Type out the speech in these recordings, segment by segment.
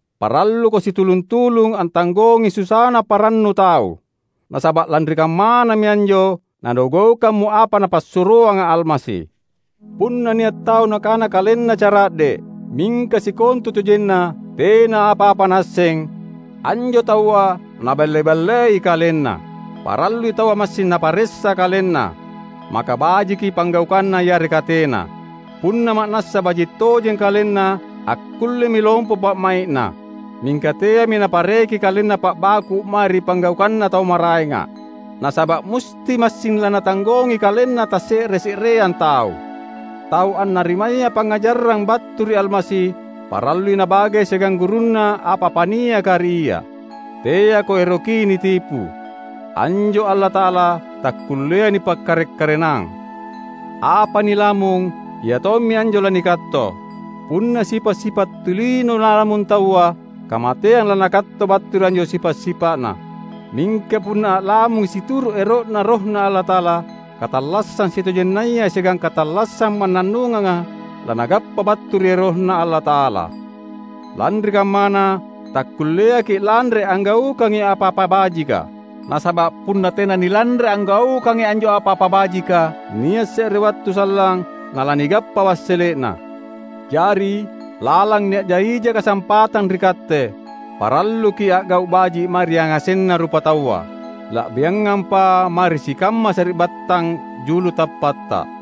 Paralluko situlung-tulung antanggongi susana parannu tau, nasaba’ lanri kammanami anjo nanugaukammo apa Napassuroanga Almasi. Punna nia’ tau nakana kalenna cara’de’, mingka sikontutojenna tena apa-apa naasseng, anjo taua naballe-ballei kalenna. Parallui taua massing naparessa kalenna, maka bajiki panggaukanna yareka tena. Punna ma’nassa baji’ tojeng kalenna, akkullemi lompo pa’mai’na. Mingka teami napareki kalenna pa’baku’ mae ri panggaukanna tau maraenga. Nasaba’ musti massing lanatanggongi kalenna tasse’re-se’reang tau. Tau annarimaya pangngajarang battu ri Almasi, parallui nabage siagang gurunna apa-apa niaka ri ia. Teako eroki nitipu. Anjo Allata’ala takkulleai nipakkarek-karenang! Apa nilamung iatommi anjo lanikatto. Punna sipa’-sipa’ tulino nalamung taua, kamateang lanakatto battu ri anjo sipa’-sipa’na. Mingka punna a’lamungi situru’ ero’Na RohNa Allata’ala, katallassang sitojennaya siagang katallassang mannannunganga lanagappa battu ri RohNa Allata’ala. Lanri kammana, takkulleaki’ lanre anggaukangi apa-apa bajika; nasaba’ punna tena nilanre anggaukangi anjo apa-apa bajika, nia’ se’re wattu sallang nalanigappa wassele’na. Jari, lalang nia’na ija kasampatang ri katte, paralluki’ a’gau’ baji’ mae ri yangasenna rupataua, la’biangampa mae ri sikamma sari’battang julu tappatta.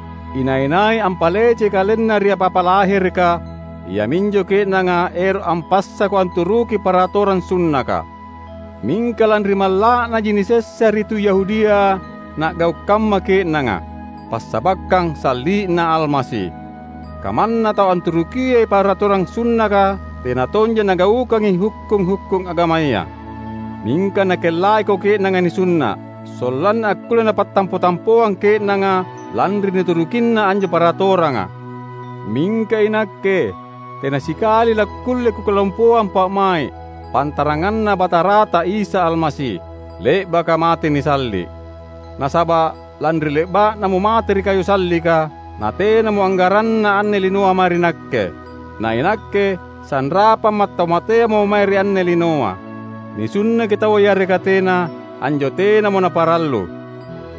Inai-nai ampalecei kalenna ri apa-apa lahereka, iaminjo ke’nanga ero’ ampassako anturuki paratorang sunnaka. Mingka lanri malla’naji nisessa ri tu Yahudia na’gau’ kamma ke’nanga, passabakkang salli’Na Almasi. Kamanna tau anturukiai paratorang sunnaka tena tonja nagaukangi hukkung-hukkung agamaya. Mingka nakellaiko ke’nanga nisunna’, sollanna akkulle napattampo-tampoang ke’nanga lanri nuturukinna anjo paratoranga. Mingka inakke tena sikali lakkulle kukalompoang pa’mai’, pantaranganna Batarata Isa Almasi, le’baka mate nisalli’. Nasaba’ lanri le’ba’Namo mate ri kayu sallika, natenamo anggaranna anne linoa mae ri nakke. Na inakke sanrapamma’ tau mateamo mae ri anne linoa. Nisunnaki taua yareka tena, anjo tenamo naparallu.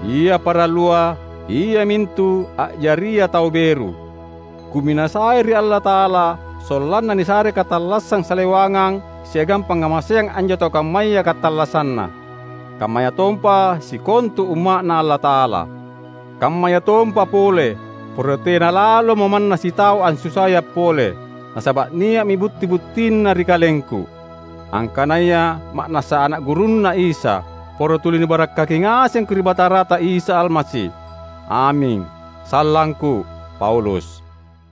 Ia parallua, iamintu a’jaria tau beru. Kuminasai ri Allata’ala sollanna nisare katallassang salewangang siagang pangngamaseang anjo tau kammaya katallassanna; kammayatompa sikontu umma’Na Allata’ala. Kammayatompa pole, poro tena lalomo manna sitau ansusaia’ pole; nasaba’ nia’mi butti-buttina ri kalengku, angkanaya ma’nassa ana’ gurunNa’ Isa. Poro tuli nibarakkaki ngasengko ri Batarata Isa Almasi. Aming. Sallangku, Paulus